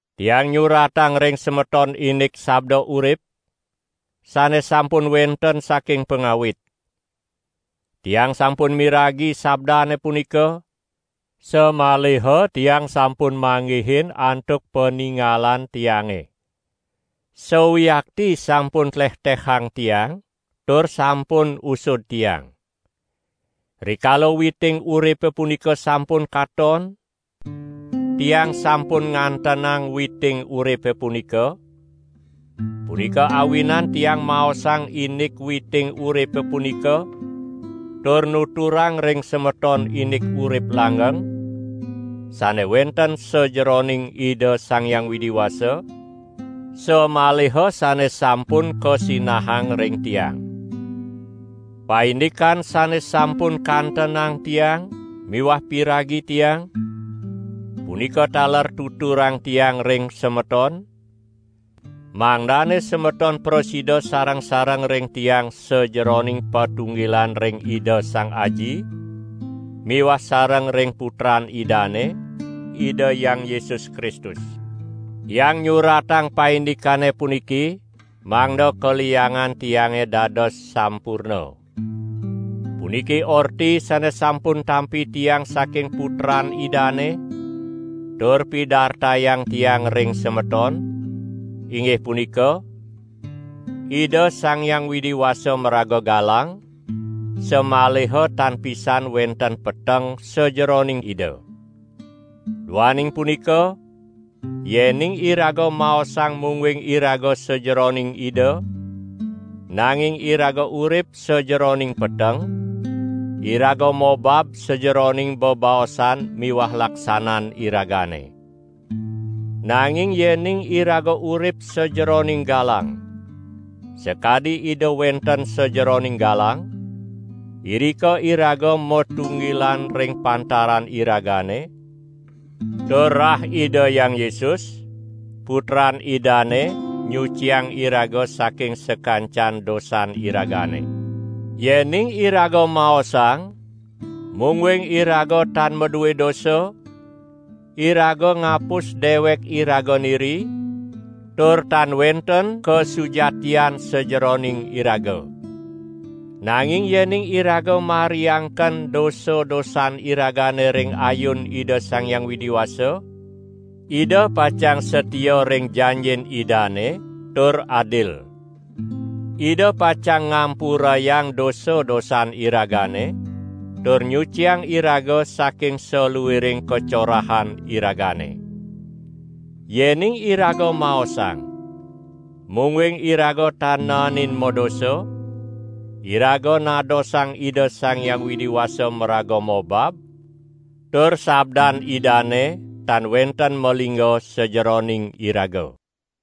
Tiang nyuratang ring semeton indik Sabda Urip, sane sampun wenten saking pangawit. Tiang sampun miragi sabdane punika, samaliha tiang sampun manggihin antuk paningalan tiange. Sawiakti sampun tlehtehang tiang tur sampun usud tiang. Rikala witing uripe punika sampun katon, tiang sampun ngantenang witing uripe punika; punika awinan tiang maosang indik witing uripe punika tur nuturang ring semeton indik urip langgeng, sane wenten sajeroning Ida Sang Hyang Widi Wasa, samaliha sane sampun kasinahang ring tiang. Paindikan sane sampun kantenang tiang miwah piragi tiang, punika taler tuturang tiang ring semeton, mangdane semeton prasida sareng-sareng ring tiang sajeroning patunggilan ring Ida Sang Aji miwah sareng ring Putran Idane, Ida Hyang Yesus Kristus. Tiang nyuratang paindikane puniki, mangda kaliangan tiange dados sampurna. Puniki orti sane sampun tampi tiang saking Putran Idane tur pidartayang tiang ring semeton, inggih punika: Ida Sang Hyang Widi Wasa maraga galang, samaliha tan pisan wenten peteng sajeroning Ida. Duaning punika, yening iraga maosang mungguing iraga sajeroning Ida, nanging iraga urip sajeroning peteng, iraga mobab sajeroning bebaosan miwah laksanan iragane. Nanging yening iraga urip sajeroning galang, sakadi Ida wenten sajeroning galang, irika iraga matunggilan ring pantaran iragane, tur rah Ida Hyang Yesus, Putran Idane nyuciang iraga saking sakancan dosan iragane. Yening iraga maosang, mungguing iraga tan madue dosa, iraga ngapus dewek iraga niri tur tan wenten kasujatian sajeroning iraga. Nanging yening iraga mariangken dosa-dosan iragane ring ayun Ida Sang Hyang Widi Wasa, Ida pacang satia ring janjin Idane tur adil. Ida pacang ngampurayang dosa-dosan iragane tur nyuciang iraga saking saluiring kacorahan iragane. Yening iraga maosang, mungguing iraga tan naenin madosa, iraga nadosang Ida Sang Hyang Widi Wasa maraga mobab tur sabdan Idane tan wenten malingga sajeroning iraga.